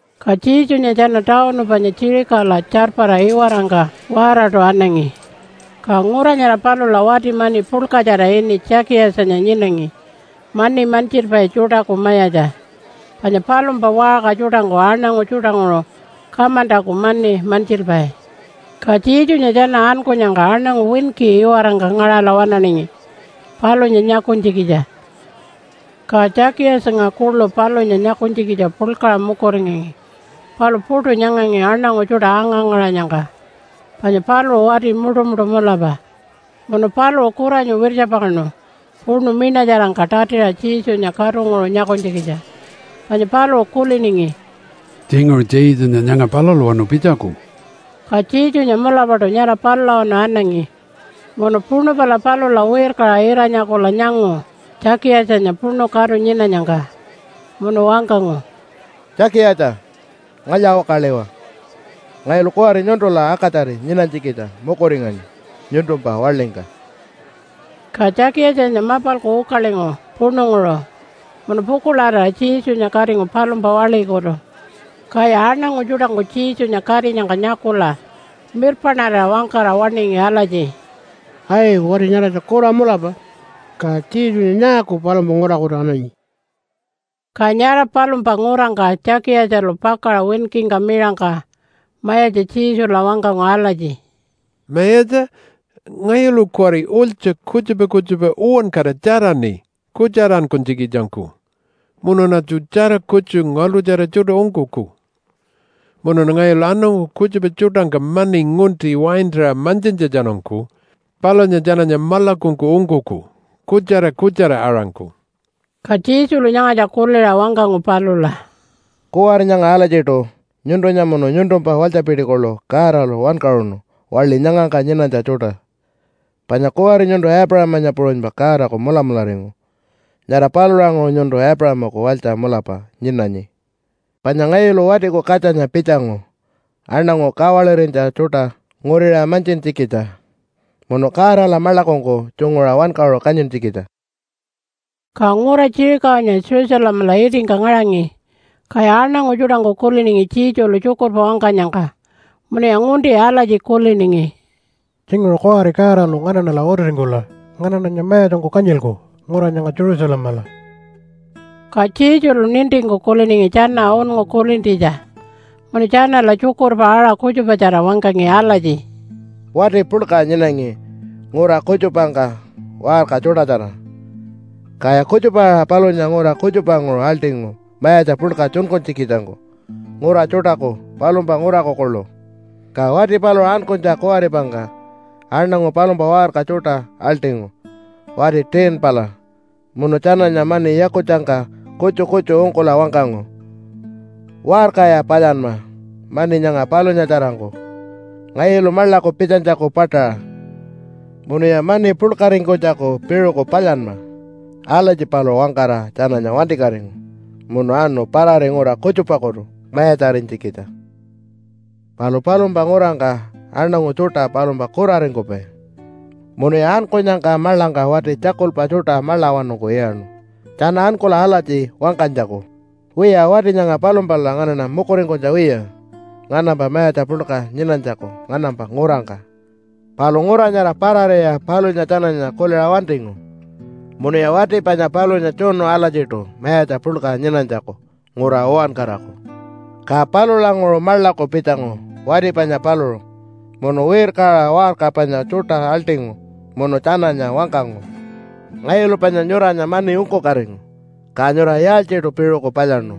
Ka Jesunya tjana tawunu panya Jerichola tjarpara iwarangka waaraṯu anangi. Ka ngura nyara palula wati mani puḻkatjara ini Tjakiyatjanya nyinangi mani mantjilpai tjuṯaku mayatja, panya palumpa waṟka tjuṯangku aṉangu tjuṯanguṟu kamantaku mani mantjilpai. Ka Jesunya tjana ankunyangka aṉangu winki iwarangka ngaṟala waṉaningi palunya nyakunytjikitja. Ka Tjakiyatjanya kuḻu palunya nyakunytjikitja puḻkaṟa mukuringangi. Palu puṯu nyangangi aṉangu tjuṯa anga-ngaṟanyangka, panya paluṟu wati muṯumuṯu mulapa. Munu paluṟu kuranyu wirtjapakaṉu puṉu miṉatjarangka tatiṟa Jesunya katunguṟu nyakunytjikitja panya paluṟu kuliningi, “Tjinguṟu Jesunya nyanga palulawanu pitjaku.” Ka Jesunya mulapaṯu nyara palulawanu anangi munu puṉu pala palula wirkaṟa ira-nyakula nyangu Tjakiyatjanya puṉu katu nyinanyangka munu wangkangu, “Tjakiyatja! Ngalya-ukaliwa! Ngayulu kuwari nyuntula akatjari nyinanytjikitja mukuringanyi nyuntumpa waḻingka.” Ka Tjakiyatjanya mapalku ukalingu puṉunguṟu, munu pukuḻarira Jesunya katingu palumpa waḻikutu. Kaya aṉangu tjuṯangku Jesunya katinyangka nyakula mirpaṉarira wangkara waṉingi alatji, “Ai! Wati nyaratja kura mulapa. Ka Jesunya nyaaku palumpa ngurakutu ananyi?” Ka nyara palumpa ngurangka Tjakiyatjalu pakaṟa winkingka miṟangka Mayatja Jesula wangkangu alatji, “Mayatja, ngayulu kuwari ulytja kutjupa kutjupa uwankara tjaraṉi kutjarankunytjikitjangku munuṉatju tjara kutju ngaḻṯutjara tjuṯa ungkuku. Munuṉa ngayulu aṉangu kutjupa tjuṯangka mani ngunti waintaṟa mantjintjatjanungku palunya tjananya maḻakungku ungkuku kutjara kutjara-aṟangku.” Ka Jesulu nyangatja kuliṟa wangkangu palula, “Kuwari nyanga alatjiṯu nyuntunya munu nyuntumpa walytjapiti kuḻu Godalu wankaṟunu waḻi nyangangka nyinanytja tjuṯa. Panya kuwari nyuntu Aipuṟamanya puṟunypa Godaku mulamularingu. Nyara palulanguṟu nyuntu Aipuṟamaku walytja mulapa nyinanyi. Panya ngayulu Watiku Katjanya pitjangu aṉangu kawalirinytja tjuṯa nguriṟa mantjintjikitja munu Godala maḻakungku tjunguṟa wankaṟu kanyintjikitja.” Ka ngura Jerichonya Jerusalemala itingka ngaṟangi, kaya aṉangu tjuṯangku kuliningi Jesulu tjukurpa wangkanyangka. Munuya ngunti alatji kuliningi, “Tjinguṟu kuwari Godalu nganaṉala utiringkula nganaṉanya mayatjangku kanyilku ngura nyanga Jerusalemala.” Ka Jesulu nintingku kuliningi tjana unngu kulintjitja, munu tjanala tjukurpa aṟa kutjupatjara wangkangi alatji, “Wati puḻka nyinangi ngura kutjupangka waṟka tjuṯatjara. Kaya kutjupa-aṟa palunya ngura kutjupanguṟu aḻṯingu mayatja puḻka tjunkunytjikitjangku ngura tjuṯaku palumpa nguraku kuḻu. Ka wati paluṟu ankunytja kuwaripangka aṉangu palumpa waṟka tjuṯa aḻṯingu wati 10-pala munu tjananya mani yakutjangka kutju kutju ungkula wangkangu, ‘Waṟkaya palyanma mani nyanga palunyatjarangku ngayulu maḻaku pitjanytjaku paṯaṟa munuya mani puḻkaringkunytjaku piṟuku palyanma.’ Alatji paluṟu wangkara tjananya wantikatingu munu anu parari ngura kutjupakutu mayatjarinytjikitja. “Palu palumpa ngurangka aṉangu tjuṯa palumpa kuraringkupai, munuya ankunyangka maḻangka wati tjakulpa tjuṯa maḻawanungku iyaṉu tjana ankula alatji wangkanytjaku, ‘Wiya, wati nyanga palumpala nganaṉa mukuringkunytja wiya nganampa mayatja puḻka nyinanytjaku nganampa ngurangka.’ Palu ngura nyara parariya palunya tjananya kuliṟa wantingu munuya wati panya palunya tjunu alatjiṯu mayatja puḻka nyinanytjaku ngura uwankaraku. Ka palulanguṟu maḻaku pitjangu wati panya paluṟu munu wirkaṟa waṟka panya tjuṯa aḻṯingu munu tjananya wangkangu, ‘Ngayulu panya nyuranya mani ungkukatingu. Ka nyura yaaltjiṯu piṟuku palyaṉu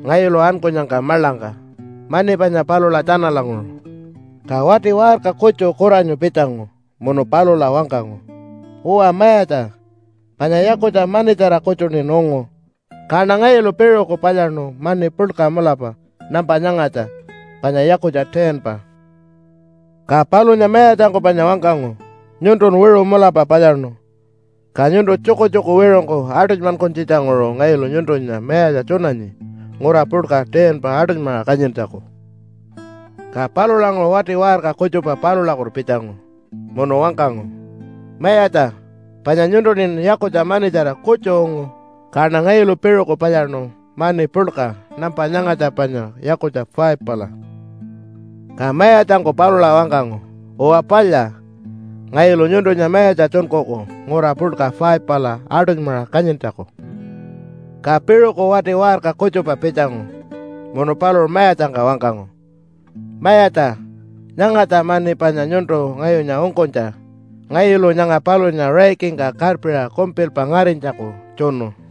ngayulu ankunyangka maḻangka mani panya palula tjanalanguṟu?’ “Ka wati waṟka kutju kuranyu pitjangu munu palula wangkangu, ‘Uwa mayatja, panya yakutja manitjara kutjuṉin ungu. Kaṉa ngayulu piṟuku palyaṉu mani puḻka mulapa nampa nyangatja panya yakutja 10-pa.’ “Ka palunya mayatjangku panya wangkangu, ‘Nyuntun wiṟu mulapa palyaṉu. Ka nyuntu tjukutjuku wiṟungku aṯunymankunytjitjanguṟu ngayulu nyuntunya mayatja tjunanyi ngura puḻka 10-pa aṯunymaṟa kanyintjaku.’ “Ka palulanguṟu wati waṟka kutjupa palulakutu pitjangu munu wangkangu, ‘Mayatja, panya nyuntuṉin yakutja manitjara kutju ungu, kaṉa ngayulu piṟuku palyaṉu mani puḻka nampa nyangatja panya yakutja 5-pala.’ “Ka mayatjangku palula wangkangu, ‘Uwa palya. Ngayulu nyuntunya mayatja tjunkuku ngura puḻka 5-pala aṯunymaṟa kanyintjaku.’ “Ka piṟuku wati waṟka kutjupa pitjangu munu paluṟu mayatjangka wangkangu, ‘Mayatja, nyangatja mani panya nyuntu ngayunya ungkunytja. Ngayulu nyanga palunya raikingka karpiṟa kumpilpa ngarinytjaku tjunu.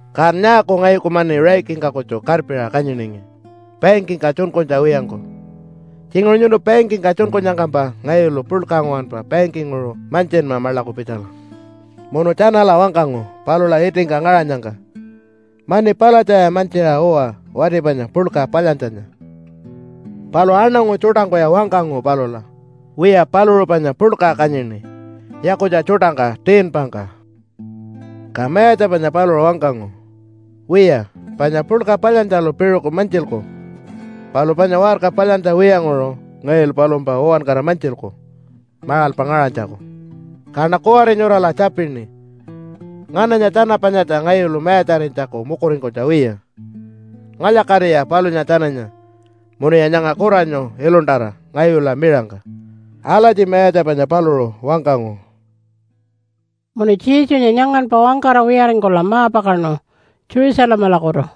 Kan nyaaku ngayuku mani raikingka kutju karpiṟa kanyiningi bankingka tjunkunytja wiyangku? Tjinguṟu nyuntu bankingka tjunkunyangkampa ngayulu puḻka nguwanpa bankinguṟu mantjinma maḻaku pitjala.’ Munu tjanala wangkangu palula itingka ngaṟanyangka, ‘Mani palatjaya mantjiṟa uwa wati panya puḻka palyantjanya.’ “Palu aṉangu tjuṯangkuya wangkangu palula, ‘Wiya, paluṟu panya puḻka kanyini yakutja tjuṯangka 10-pangka.’ “Ka mayatja panya paluṟu wangkangu, ‘Wiya, panya puḻka palyantjalu piṟuku mantjilku, palu panya waṟka palyantja wiyanguṟu ngayulu palumpa uwankara mantjilku maṟalpa ngaṟanytjaku. Kaṉa kuwari nyurala tjapini, “Ngananya tjana panyatja ngayulu mayatjarinytjaku mukuringkunytja wiya? Ngalya-katiya palunya tjananya munuya nyanga kuranyu iluntara ngayula miṟangka!” ’ Alatji mayatja panya paluṟu wangkangu.” Munu Jesunya nyanganpa wangkara wiyaringkula ma-pakaṉu Jerusalemalakutu.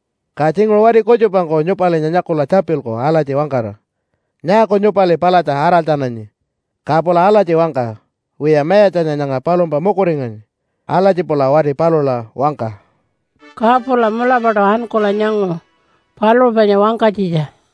Ka tjinguṟu wati kutjupangku nyupalinya nyakula tjapilku alatji wangkara, ‘Nyaaku nyupali palatja araltjananyi?’ Ka pula alatji wangka, ‘Wiya, Mayatjanya nyanga palumpa mukuringanyi.’ Alatji pula wati palula wangka.” Ka pula mulapaṯu ankula nyangu paluṟu panya wangkanytjitja.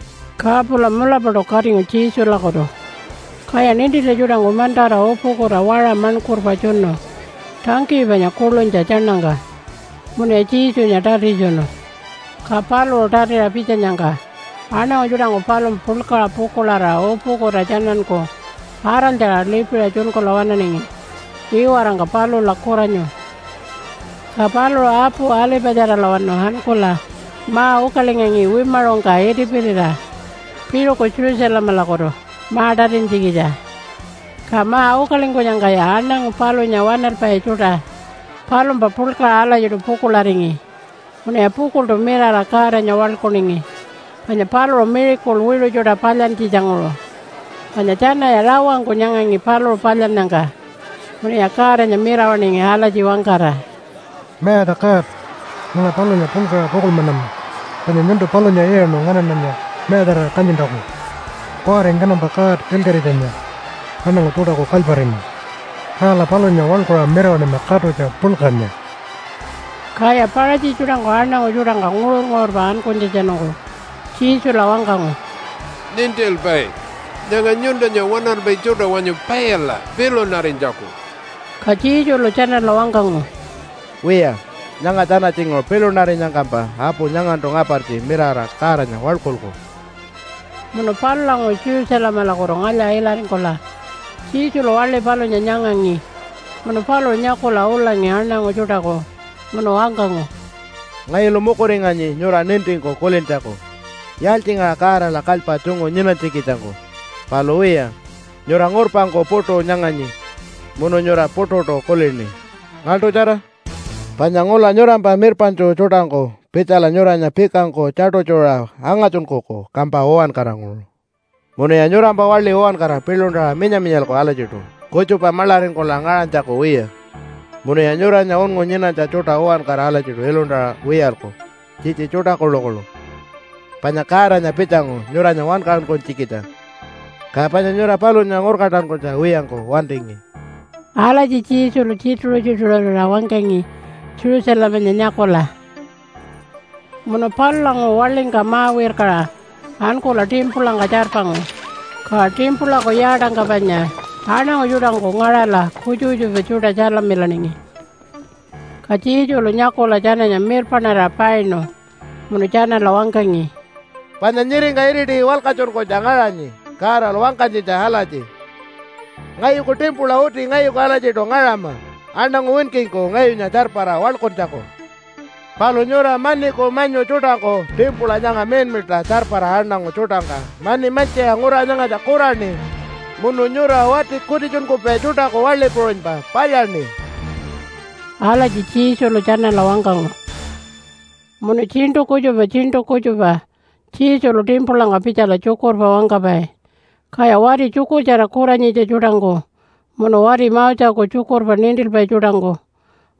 Ka pula mulapaṯu katingu Jesulakutu, kaya nintintja tjuṯangku mantara upukuta waṟa maṉkurpa tjunu tangkiyi panya kuḻunytja tjaṉangka munuya Jesunya tatitjunu. Ka paluṟu tatiṟa pitjanyangka aṉangu tjuṯangku palumpa puḻkaṟa pukuḻarira upukuta tjananku araltjara lipiṟa tjunkula waṉaningi iwarangka palula kuranyu. Ka paluṟu apu Alipatjaralawanu ankula ma-ukalingangi wimaṟungka itipirira piṟuku Jerusalemalakutu ma-tatintjikitja. Ka ma-ukalingkunyangkaya aṉangu palunya waṉalpai tjuṯa palumpa puḻkaṟa alatjiṯu pukuḻaringi, munuya pukuḻṯu mirara Godanya waḻkuningi, panya paluṟu miracle wiṟu tjuṯa palyantjitjanguṟu, panya tjanaya rawangku nyangangi paluṟu palyannyangka. Munuya Godanya mirawaṉingi alatji wangkara, “Mayatja God, nyanga palunya puḻkaṟa pukuḻmanama, panya nyuntu palunya iyaṉu nganaṉanya mayatjarira kanyintjaku. Kuwari nganampa God Ilkaṟitjanya aṉangu tjuṯaku kalyparingu. Kala palunya waḻkuṟa mirawaṉima katutja puḻkanya!” Kaya Paṟatji tjuṯangku aṉangu tjuṯangka nguṟur-nguṟurpa ankunytjatjanungku Jesula wangkangu, “Nintilpai, nyanga nyuntunya waṉalpai tjuṯa wanyu paila pilunarinytjaku!” Ka Jesulu tjanala wangkangu, “Wiya, nyanga tjana tjinguṟu pilunarinyangkampa apu nyangantu ngapartji mirara Godanya waḻkulku.” Munu palulanguṟu Jerusalemalakutu ngalya-ilaringkula Jesulu waḻi palunya nyangangi munu paluṟu nyakula ulangi aṉangu tjuṯaku munu wangkangu, “Ngayulu mukuringanyi nyura nintingku kulintjaku yaaltjingaṟa Godala kalypa tjungu nyinanytjikitjangku. Palu wiya, nyura ngurpangku puṯu nyanganyi munu nyura puṯuṯu kulini. Ngaḻṯutjara! Panya ngula nyurampa mirpaṉtju tjuṯangku pitjala nyuranya pikangku tjaṯutjuṟa angatjunkuku kampa uwankaranguṟu. Munuya nyurampa waḻi uwankara piḻuntaṟa minya-minyalku alatjiṯu kutjupa maḻaringkula ngaṟanytjaku wiya, munuya nyuranya unngu nyinanytja tjuṯa uwankara alatjiṯu iluntara wiyalku tjitji tjuṯa kuḻukuḻu. Panya Godanya pitjangu nyuranya wankaṟunkunytjikitja, ka panya nyura palunya ngurkantankunytja wiyangku wantingi.” Alatji Jesulu tjituṟu-tjituṟurira wangkangi Jerusalemanya nyakula. Munu palulanguṟu waḻingka ma-wirkaṟa ankula timpulangka tjarpangu. Ka timpulaku yaatangka panya aṉangu tjuṯangku ngaṟala kutjupa kutjupa tjuṯa tjalamilaningi. Ka Jesulu nyakula tjananya mirpaṉarira painu. Munu tjanala wangkangi, “Panya nyiringka iriti walkatjunkunytja ngaṟanyi Godalu wangkanytjitja alatji, ‘Ngayuku timpula uti ngayuku alatjiṯu ngaṟama aṉangu winkingku ngayunya tjarpara waḻkuntjaku.’ Palu nyura maniku manyu tjuṯangku timpula nyanga miḻmiḻṯa tjarpara aṉangu tjuṯangka mani mantjiṟa ngura nyangatja kuraṉi munu nyura wati kutitjunkupai tjuṯaku waḻi puṟunypa palyaṉi.” Alatji Jesulu tjanala wangkangu. Munu tjiṉṯu kutjupa tjiṉṯu kutjupa Jesulu timpulangka pitjala tjukurpa wangkapai. Kaya wati tjukurtjara kuranyitja tjuṯangku, munu wati Moseku tjukurpa nintilpai tjuṯangku,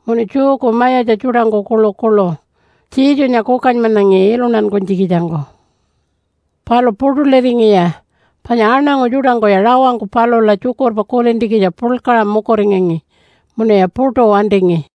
munu Jewku mayatja tjuṯangku kuḻukuḻu Jesunya kukanymanangi iluntankunytjikitjangku. Palu puṯuliringiya panya aṉangu tjuṯangkuya rawangku palula tjukurpa kulintjikitja puḻkaṟa mukuringangi munuya puṯu wantingi.